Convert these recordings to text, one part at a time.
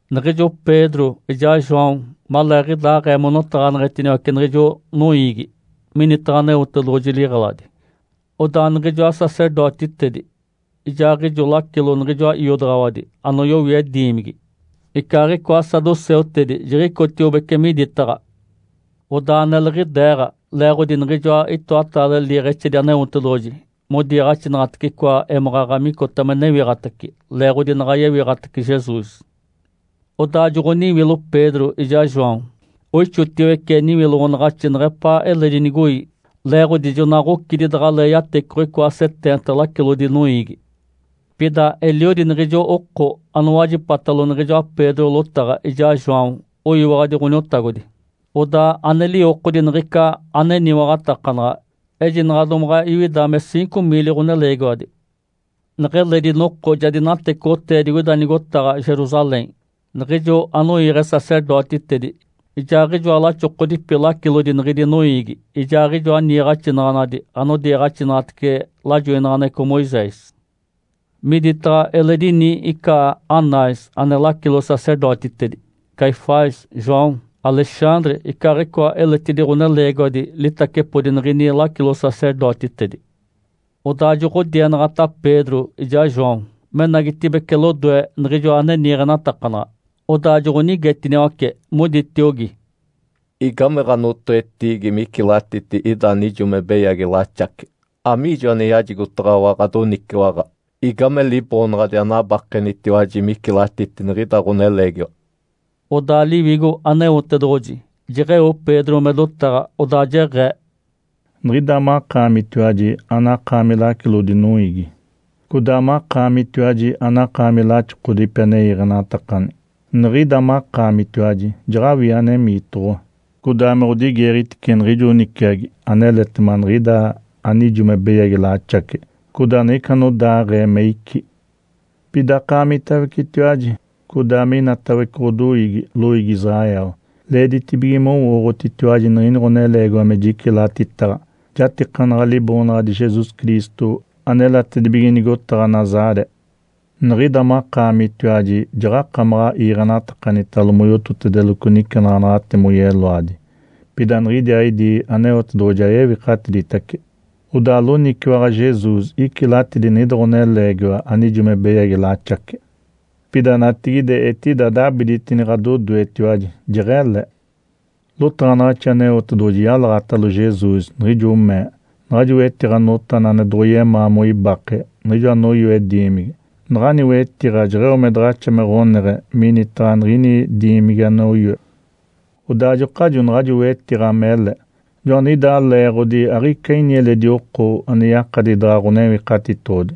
Niɡ̶ijo Pedro ijaa João maleeɡ̶idaaɡ̶ee monotaɡ̶aneɡ̶etiniwace niɡ̶ijo noiigi minitaɡ̶a Aneotedoɡ̶oji liɡ̶eladi, odaa niɡ̶ijoa sacerdotitedi ijaaɡ̶ijo lacilo niɡ̶ijoa iodaɡ̶awadi anoyowie diimigi icaaɡ̶icoa saduceutedi jiɡ̶icotiobece miditaɡ̶a. Odaa neliɡ̶ideeɡ̶a leeɡ̶odi niɡ̶ijoa itoataale liiɡ̶exedi Aneotedoɡ̶oji modiiɡ̶axinaɡ̶atece icoa émaɡ̶aɡ̶a micota me newiɡ̶atace leeɡ̶odi naɡ̶a yewiɡ̶atace Jesus. Odaa joɡ̶oniwilo Pedro ijaa João, oixotiwece niwiloɡ̶onaɡ̶axi neɡ̶epaa eledi nigoi, leeɡ̶odi jona ɡ̶ocidi daɡ̶alee yatecoɡ̶o icoa seteenta lacilodi noiigi. Pida eliodi niɡ̶ijo oko anowajipatalo niɡ̶ijoa Pedro lotaɡ̶a ijaa João oyiwaɡ̶adi Ǥoniotagodi, odaa ane liwokodi niɡ̶ica ane eniwaɡ̶atakanaɡ̶a ejinaɡ̶a domaɡ̶a iwida me ciinco miili ɡ̶oneleegiwadi. Neɡ̶eledi noko ja dinatecoɡ̶otee digoida nigotaɡ̶a Jerusalém niɡ̶ijo anoiiɡ̶e sacerdotitedi, ijaaɡ̶ijoa laxokodipi lacilodi niɡ̶idi noiigi, ijaaɡ̶ijoa niiɡ̶axinaɡ̶anadi anodiiɡ̶axinaɡ̶atece lajoinaɡ̶aneɡ̶eco Moisés. Miditaɡ̶a eledi ini ica Anás ane lacilo-sacerdotitedi, Caifás, João, Alexandre icaaɡ̶icoa eletidi ɡ̶oneleegiwadi litacepodi niɡ̶ini lacilo-sacerdotitedi. Odaa joɡ̶odienaɡ̶ata Pedro ijaa João menagitibeci lodoe niɡ̶ijo ane niiɡ̶enatakanaɡ̶a, odaa joɡ̶onigetiniwace, moditiogi, “Igame ɡ̶anotoetiigi micilatiti ida anijo me beyagi laxace? Amiijo ane yajigotaɡ̶awa ɡ̶adoniciwaɡ̶a? Igame liboonaɡ̶adi anabakenitiwaji micilatiti niɡ̶ida ɡ̶oneleegiwa?” Odaa Liwigo Aneotedoɡ̶oji jeɡ̶eo Pedro me dotaɡ̶a, odaa jeɡ̶ee, “Niɡ̶ida makaamitiwaji anakaami lacilodi noiigi, codaa makaamitiwaji anakaami laxokodipi ane iiɡ̶enatakani. Niɡ̶ida makaamitiwaji jaɡ̶awini anemiitoɡ̶owa, codaa me ɡ̶odigeeɡ̶egitece niɡ̶ijo niciagi aneletema niɡ̶ida anijo me beyagi laxace, codaa niɡ̶ica anodaaɡ̶ee me icí. Pida akaamitawecetiwaji codaa me inatawece ɡ̶odoiigi, loiigi Israel leeditibige mowooɡ̶otitiwaji niɡ̶ini ɡ̶oneleegiwa me jicilatitaɡ̶a jatikanaɡ̶a Liboonaɡ̶adi Jesus Cristo anelatedibige nigotaɡ̶a Nazaré. Niɡ̶ida makaamitiwaji jaɡ̶akamaɡ̶a iiɡ̶enatakanitalo moyototedeloco nicenaɡ̶anaɡ̶ate moyeloadi, pida niɡ̶idiaaɡ̶idi Aneotedoɡ̶oji ja yewikatiditace. Odaa loniciwaɡ̶a Jesus icilatidi niɡ̶ida ɡ̶oneleegiwa anijo me beyagi laxace, pida natigide etida dabiditini ɡ̶adodoetiwaji, jeɡ̶ele. Lotaɡ̶anaɡ̶axi Aneotedoɡ̶oji yalaɡ̶atalo Jesus, niɡ̶ijo mee, ‘Naɡ̶ajo wetiɡ̶a notana ane doɡ̶oyemaa moibake, niɡ̶ijo anoyoe diimigi, naɡ̶ani wetiɡ̶a jeɡ̶eo me daɡ̶axa me ɡ̶oneɡ̶e minitaɡ̶a niɡ̶ini diimigi anoyoe.’ Odaa ajokajo naɡ̶ajo wetiɡ̶a mele. Joaniɡ̶idaa leeɡ̶odi aɡ̶ica ini eledi oko ane yakadi daɡ̶a Ǥonewikatitoɡ̶odi.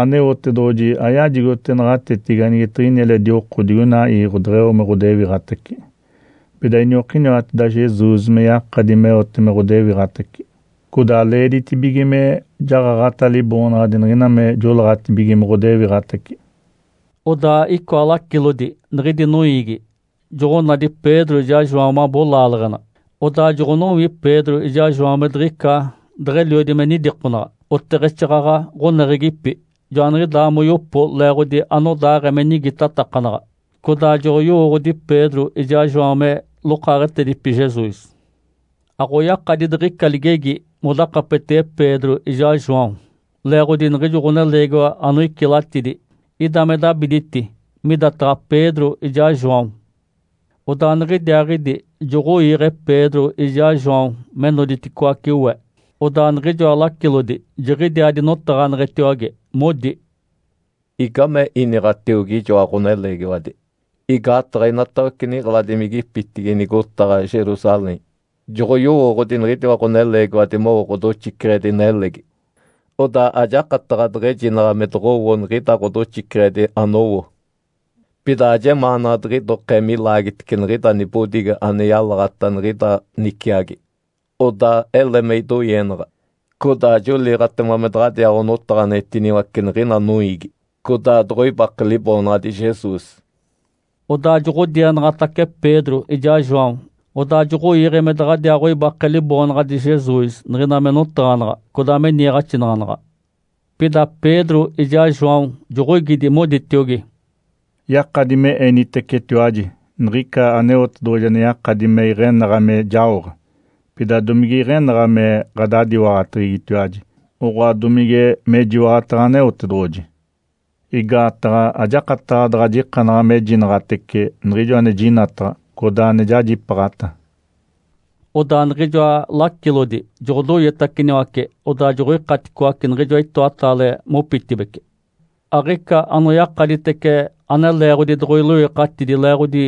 Aneotedoɡ̶oji ayajigote naɡ̶atetigi anigetiɡ̶ini eledi oko digoina iiɡ̶o deɡ̶eo me ɡ̶odewiɡ̶atace. Pida iniokiniwateda Jesus me yakadi meote me ɡ̶odewiɡ̶atace, codaa leeditibige me jaɡ̶aɡ̶ata Liboonaɡ̶adi niɡ̶ina me joleeɡ̶atibige me ɡ̶odewiɡ̶atace.” Odaa icoa lacilodi niɡ̶idi noiigi joɡ̶onadi Pedro ijaa João mabo laaleɡ̶ena. Odaa joɡ̶onowi Pedro ijaa João me diɡ̶ica deɡ̶eliodi me nidikonaɡ̶a, oteɡ̶exaaɡ̶aɡ̶a ɡ̶oneɡ̶egipi. Joaniɡ̶idaa moyopo leeɡ̶odi anodaaɡ̶ee me nigitatakanaɡ̶a. Codaa joɡ̶oyowooɡ̶odi Pedro ijaa João me lokaaɡ̶etedipi Jesus. Aɡ̶oyakadi diɡ̶ica ligegi modakapetege Pedro ijaa João leeɡ̶odi niɡ̶ijo ɡ̶oneleegiwa anoicilatidi ida me dabiditi midataɡ̶a Pedro ijaa João. Odaa niɡ̶idiaaɡ̶idi joɡ̶oiiɡ̶e Pedro ijaa João me noditicoaci we, odaa niɡ̶ijoa lacilodi jiɡ̶idiaa dinotigimadetiwage. Modi, “Igame iniɡ̶atiogi ijoa ɡ̶oneleegiwadi? Igaataɡ̶a inatawece niɡ̶eladimigipitigi nigotaɡ̶a Jerusalém joɡ̶oyowooɡ̶odi niɡ̶idiwa ɡ̶oneleegiwadi mowo ɡ̶odoxiceɡ̶edi nelegi, odaa ajakataɡ̶a deɡ̶ejinaɡ̶a me doɡ̶owo niɡ̶ida ɡ̶odoxiceɡ̶edi anowo. Pida ajemaanaɡ̶a diɡ̶idokee milaagitice niɡ̶ida nibodigi ane yalaɡ̶ata niɡ̶ida niciagi. Odaa ele me idoienaɡ̶a, codaa joliiɡ̶atema me daɡ̶adiaa onotaɡ̶aneɡ̶etiniwace niɡ̶ina noiigi, codaa doɡ̶oibake Liboonaɡ̶adi Jesus.” Odaa joɡ̶odienaɡ̶atace Pedro ijaa João, odaa joɡ̶oiiɡ̶e me daɡ̶adiaaɡ̶oibake Liboonaɡ̶adi Jesus niɡ̶ina me notaɡ̶anaɡ̶a codaa me niiɡ̶axinaɡ̶anaɡ̶a. Pida Pedro ijaa João joɡ̶oigidi, moditiogi, “Yakadi me enitecetiwaji niɡ̶ica Aneotedoɡ̶oji ane yakadi me iɡ̶enaɡ̶a me jaoɡ̶a. Pida domige iɡ̶enaɡ̶a me ɡ̶adadiwaɡ̶ateɡ̶egitiwaji, oɡ̶oa domige mejiwaɡ̶ataɡ̶a Aneotedoɡ̶oji? Igaataɡ̶a ajakataɡ̶a daɡ̶a jikanaɡ̶a mejinaɡ̶atece niɡ̶ijo ane jinataɡ̶a, codaa ane jajipaaɡ̶ata.” Odaa niɡ̶ijoa lacilodi joɡ̶odoietaciniwace odaa joɡ̶oikaticoace niɡ̶ijoa itoataale mopitibeci. Aɡ̶ica anoyakaditece ane leeɡ̶odi doɡ̶oiloikatidi leeɡ̶odi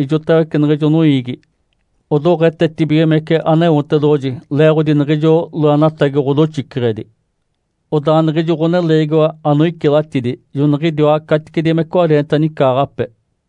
ijotawece niɡ̶ijo noiigi odoɡ̶etetibigimece Aneotedoɡ̶oji leeɡ̶odi niɡ̶ijo loenatagi ɡ̶odoxiceɡ̶edi. Odaa niɡ̶ijo ɡ̶oneleegiwa anoicilatidi joniɡ̶idiwa caticedi me cwareenta nicaaɡ̶ape.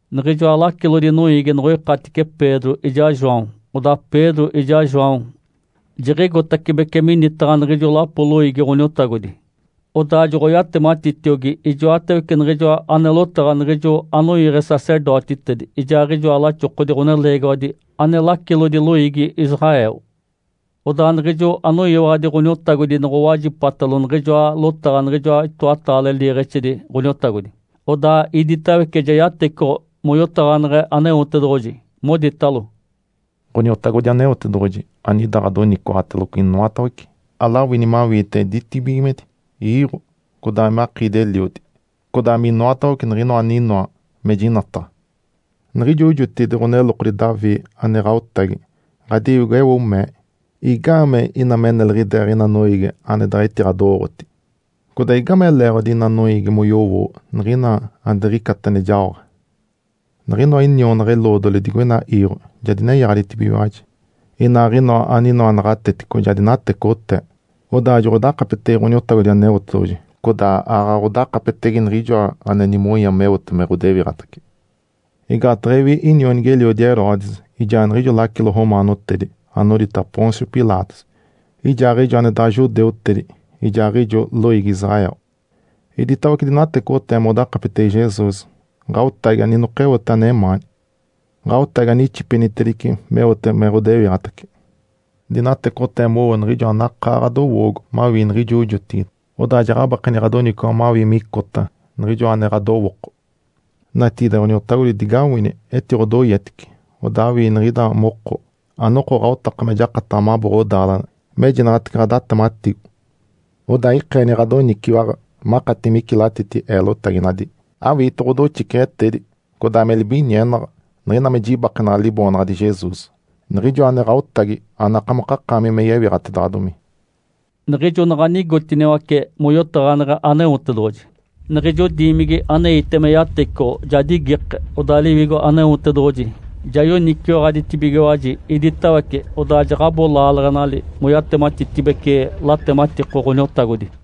Niɡ̶ijoa lacilodi noiigi noɡ̶oikatice Pedro ijaa João, odaa Pedro ijaa João jiɡ̶igotacibece minitaɡ̶a niɡ̶ijo lapo loiigi Ǥoniotagodi, odaa joɡ̶oyatematitiogi ijoatawece niɡ̶ijoa ane lotaɡ̶a niɡ̶ijo anoiiɡ̶e sacerdotitedi ijaaɡ̶ijoa laxokodi ɡ̶oneleegiwadi ane lacilodi loiigi Israel. Odaa niɡ̶ijo anoyiwaɡ̶adi Ǥoniotagodi noɡ̶owajipatalo niɡ̶ijoa lotaɡ̶a niɡ̶ijoa itoataale liiɡ̶exedi Ǥoniotagodi, odaa iditawece ja yatecoɡ̶o moyotaɡ̶aneɡ̶e Aneotedoɡ̶oji, moditalo, “Ǥoniotagodi Aneotedoɡ̶oji anida ɡ̶adoniciwaɡ̶ateloco inoatawece, alawini mawiite ditibigimedi, iiɡ̶o, codaa me akiidi-eliodi, codaa minoatawece niɡ̶inoa aninoa me jinataɡ̶a. Niɡ̶ijo jotigide ɡ̶onelokodi Davi ane ɡ̶aotagi. Ǥadiwigo eo mee, ‘Igaamee ina me neliɡ̶ideeɡ̶a ina noiigi ane daɡ̶a etiɡ̶adowooɡ̶oti? Codaa igame leeɡ̶odi ina noiigi moyowo niɡ̶ina ane diɡ̶icata ane jaoɡ̶a? Niɡ̶inoa inionaɡ̶a-eloodoli digoina iiɡ̶o ja dinenyaɡ̶aditibigiwaji, inaaɡ̶inoa aninoa naɡ̶atetico ja dinatecoɡ̶otee, odaa joɡ̶odakapetege Ǥoniotagodi Aneotedoɡ̶oji codaa aaɡ̶aɡ̶a odakapetege Niɡ̶ijoa ane nimonya meote me ɡ̶odewiɡ̶atace.’ Igaataɡ̶a ewi inionigi-eliodi Herodes, ijaa niɡ̶ijo lacilo romaanotedi anodita Pôncio Pilatos, ijaaɡ̶ijo ane daɡ̶a judeutedi ijaaɡ̶ijo loiigi Israel, iditawece dinatecoɡ̶otee modakapetege Jesus, Ǥaotagi aninokeote anemaani, Ǥaotagi anixipenitedice meote me ɡ̶odewiɡ̶atace. Dinatecoɡ̶otee mowo niɡ̶ijo anakaa ɡ̶adowoogo mawii niɡ̶ijo jotigide, odaa jaɡ̶abakeni ɡ̶adoniciwaɡ̶a mawii micota niɡ̶ijoa ane ɡ̶adowooko. Natigide, Ǥoniotagodi, digawini etiɡ̶odoietice, odaa awii niɡ̶ida moko anoko ɡ̶aotaka me jakataɡ̶a mabo ɡ̶odaaleɡ̶ena mejinaɡ̶atece ɡ̶adatematigo. Odaa ikeeni ɡ̶adoniciwaɡ̶a makati micilatiti eelotaginadi, awiite ɡ̶odoxiceɡ̶etedi codaa me libinienaɡ̶a niɡ̶ina me jibakenaɡ̶a Liboonaɡ̶adi Jesus, Niɡ̶ijoa ane Ǥaotagi anakamokakaami me yewiɡ̶atedaɡ̶adomi.” Niɡ̶ijo naɡ̶a nigotiniwace moyotaɡ̶aneɡ̶e Aneotedoɡ̶oji, niɡ̶ijo diimigi aneite me yatecoɡ̶o ja digike. Odaa Liwigo Aneotedoɡ̶oji ja yoniciwaɡ̶aditibigiwaji iditawece, odaa jaɡ̶abo laaleɡ̶enali moyatematitedibece latematiko Ǥoniotagodi.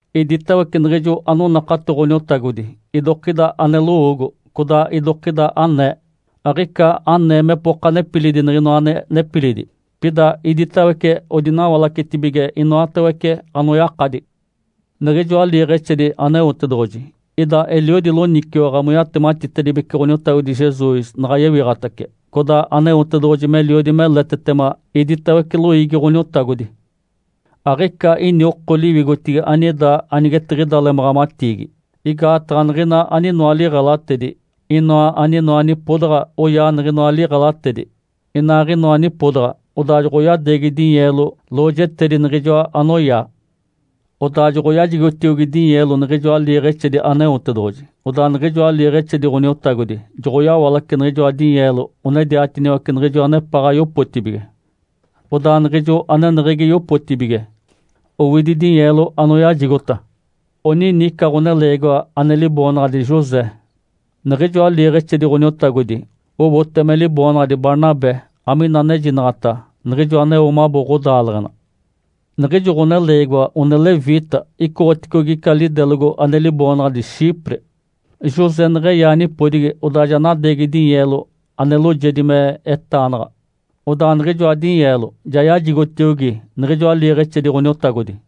Iditawece niɡ̶ijo anonakato Ǥoniotagodi idokida ane lowoogo, codaa idokida anee. Aɡ̶ica anee mepoka nepilidi niɡ̶inoa ane nepilidi, pida iditawece odinawalacetibige inoatawece anoyakadi. Niɡ̶ijoa liiɡ̶exedi Aneotedoɡ̶oji ida eliodi loniciwaɡ̶a moyatematitedibece Ǥoniotagodi Jesus naɡ̶a yewiɡ̶atace, codaa Aneotedoɡ̶oji meliodi meletetema iditawece loiigi Ǥoniotagodi. Aɡ̶ica ini oko liwigotigi anida anigetiɡ̶ida lemaɡ̶amatiigi, igaataɡ̶a niɡ̶ina aninoa liɡ̶elatedi, inoa aninoa nipodaɡ̶a oyaa niɡ̶inoa liɡ̶elatedi inaaɡ̶inoa nipodaɡ̶a, odaa joɡ̶onadeegi dinyeelo lojetedi niɡ̶ijoa anoyaa. Odaa joɡ̶oyajigotiogi dinyeelo niɡ̶ijoa liiɡ̶exedi Aneotedoɡ̶oji, odaa niɡ̶ijoa liiɡ̶exedi Ǥoniotagodi joɡ̶oyawalace niɡ̶ijoa dinyeelo onediatiniwace niɡ̶ijo anepaɡ̶a oyopotibige, odaa niɡ̶ijo aneneɡ̶egi yopotibige owidi dinyeelo anoyajigota. Onini ica ɡ̶oneleegiwa ane liboonaɡ̶adi José. Niɡ̶ijoa liiɡ̶exedi Ǥoniotagodi owote me liboonaɡ̶adi Barnabé amina anejinaɡ̶ata “Niɡ̶ijo aneo mabo ɡ̶odaaleɡ̶ena.” Niɡ̶ijo ɡ̶oneleegiwa one leviita icoɡ̶oticogi ica lidelogo ane liboonaɡ̶adi Chipre. José neɡ̶eyaa nipodigi, odaa ja nadeegi dinyeelo ane loojedi me etaanaɡ̶a, odaa niɡ̶ijoa dinyeelo ja yajigotiogi niɡ̶ijoa liiɡ̶exedi Ǥoniotagodi.